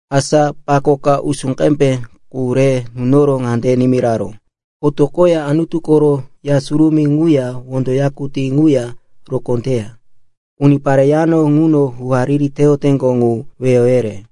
Asa pako ka usú qembe qu re nunoro ŋande nimiraró, “Otoqoya Anutu koro Ya Surumí ŋuya wondo yakutí ŋuya rokó teya unipare yano ŋuno hu-hariri teyoteŋgo ŋu weyo yere.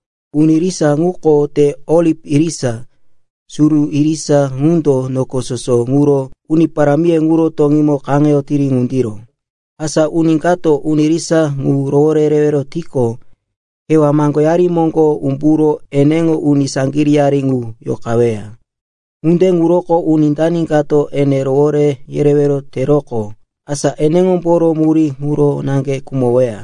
Uni irisa ŋuko te oliv irisa, suru irisa ŋundo noko soso ŋuro Uni Parámiye ŋuro toŋímo kaŋeyotiri ŋundiro. Asa uni kato uni irisa ŋu rowore yerewero tiqo, kewá maŋgoyari moŋgo umburo eneŋo uni saŋgiríyari ŋu yoqaweya. Ŋunde ŋuroko uni dani kato ene rowore yerewero teroqo, asa eneŋomboro murí ŋuro naŋge khumoweya.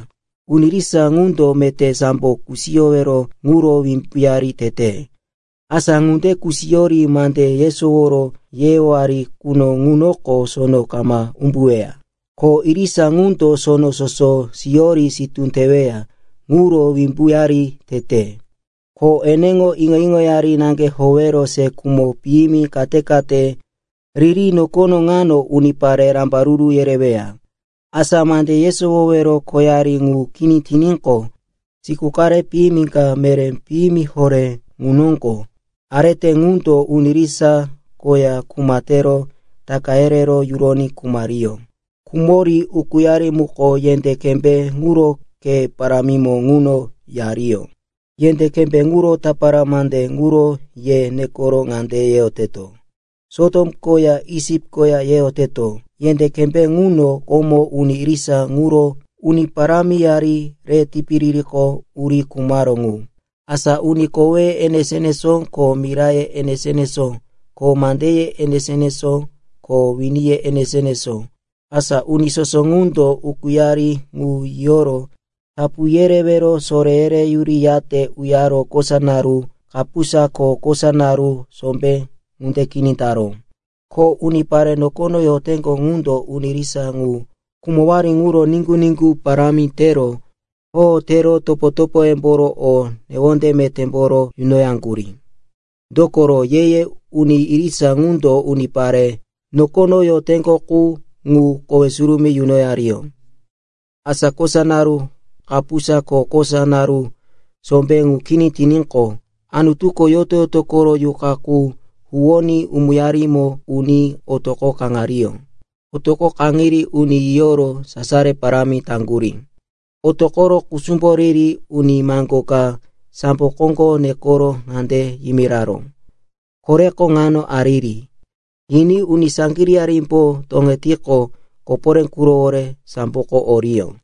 Uni irisa ŋundo meté sambo kusiyowero ŋuro wimbuyari tete. Asa ŋunde kusiyori mande yesoworo yeyowari quno ŋunoko sono kama umbuweya. Ko irisa ŋundo sono soso siyori sitú teweya ŋuro wimbuyari tete. Ko eneŋo iŋo-iŋoyari naŋge howero se khumo piyimi kate-kate riri nokono ŋano unipare rambaruru yereyoweya. Asa mande yesowowero khoyari ŋu kini tiníqo, siku qare piyimi ka meré piyimi horé ŋu noŋgo arete ŋundo uni irisa koya kuma tero taka yerero yuroní khumariyó. Khumori ukúyari muko yendé kembé ŋuro khe parámimo ŋuno yariyó. Yendé kembé ŋuro tapara mande ŋuro ye nekoro ŋande yeyoteto, “Sotom koya Isip koya,” yeyoteto. Yendé kembé ŋuno komo uni irisa ŋuro Uni Parámiyari re tipiririko uri khumaró ŋu. Asa uni koweye enesó-enesó ko miraye enesó-enesó ko mandeye enesó-enesó ko winiye enesó-enesó, asa uni soso ŋundo ukúyari ŋu yiyoro tapu yerewero soré yereyuriyate uyare kosa naru kapusa ko kosa naru sombé ŋunde kini taró. Ko unipare nokono yoteŋgo ŋundo uni irisa ŋu khumowari ŋuro niŋgu-niŋgu parámi tero hoho tero topo-topoyemboro o newonde metémboro yunoyaŋgurí. Dokoro, ye-ye uni irisa ŋundo unipare nokono yoteŋgo qu ŋu kowe surumí yunoyariyó. Asa kosa naru kapusa ko kosa naru sombé ŋu kini tiníqo, Anutuko yoto-yoto koro yuqa qu huwoní umuyarimo uní otoqo kaŋariyó. Otoqo kaŋiri uni yiyoro sasaro parámi taŋgurí. Otoqoro kusumbo riri uni maŋgó ka sambo koŋgo nekero ŋande yimiraró, “Koreko ŋano ariri.” Yiní uni saŋgiríyarimbo toŋetiqo koporé qurowore samboko oriyó.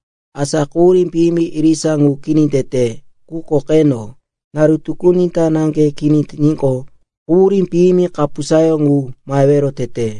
Asa quhurí piyimi irisa ŋu kini tete. Quko qeno, naru tukuni ta naŋge kini tiníqo, quhurí piyimi kapusayó ŋu mahewero tete.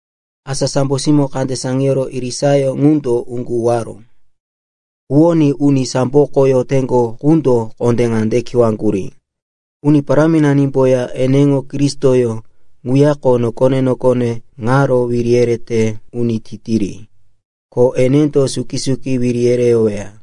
Asa sambo simó kande saŋiyoro irisayó ŋundo uŋgu huwaró. Huwoní uni samboko yoteŋgo qundo kondé ŋande kiwaŋgurí, “Uni Paráminanimboya eneŋo Kristoyó ŋuyako nokone-nokone ŋaro wiri yerete uni titiri. Ko enendo suki-suki wiri yereyoweya.”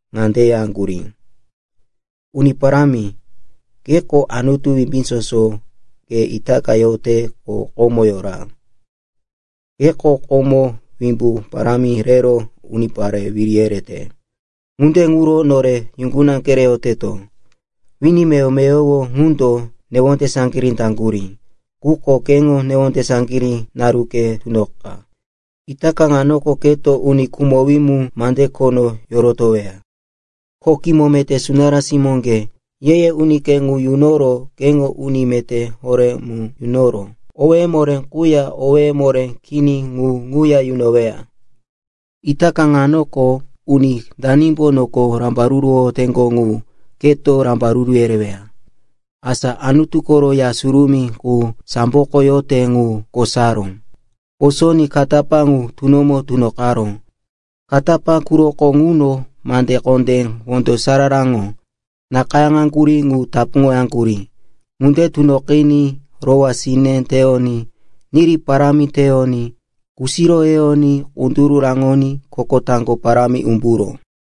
ŋande yaŋgurí, “Uni Parámi, keko Anutu Wimbí Soso. Ke itaka yote, ko komo yora. Keko komo wimbu parámi rero, unipare wiri yerete. Ŋunde ŋuro nore yuŋguna kereyoteto. Wini meyowo-meyowo ŋundo newonde saŋgirí taŋgurí, quko keŋo newonde saŋgirí naruke tunoqa. Itaka ŋanoko keto uni khumowí mu mande khono yorotoweya, ko kimo meté sunará simóŋge, ye-ye unike ŋu yunoro keŋo uni meté horé mu yunoro owéye moré quya owéye moré kini ŋu ŋuya yunoweya. Itaka ŋanoko uni danimbo noko rambaruruwoyoteŋgo ŋu keto rambaruru yereweya.” Asa Anutu koro Ya Surumí qu samboko yote ŋu kosaró. Kosoní katapá ŋu tunomo tunoqaró. Katapá quroko ŋuno mande kondé wondo sararaŋgo nakayáŋaŋgurí ŋu tapuŋoyaŋgurí. Ŋunde tunoqiní rowá sine teyoní, niri parámi teyoní, kusiro yeyoní kunduru raŋoní koko taŋgo parámi umburó.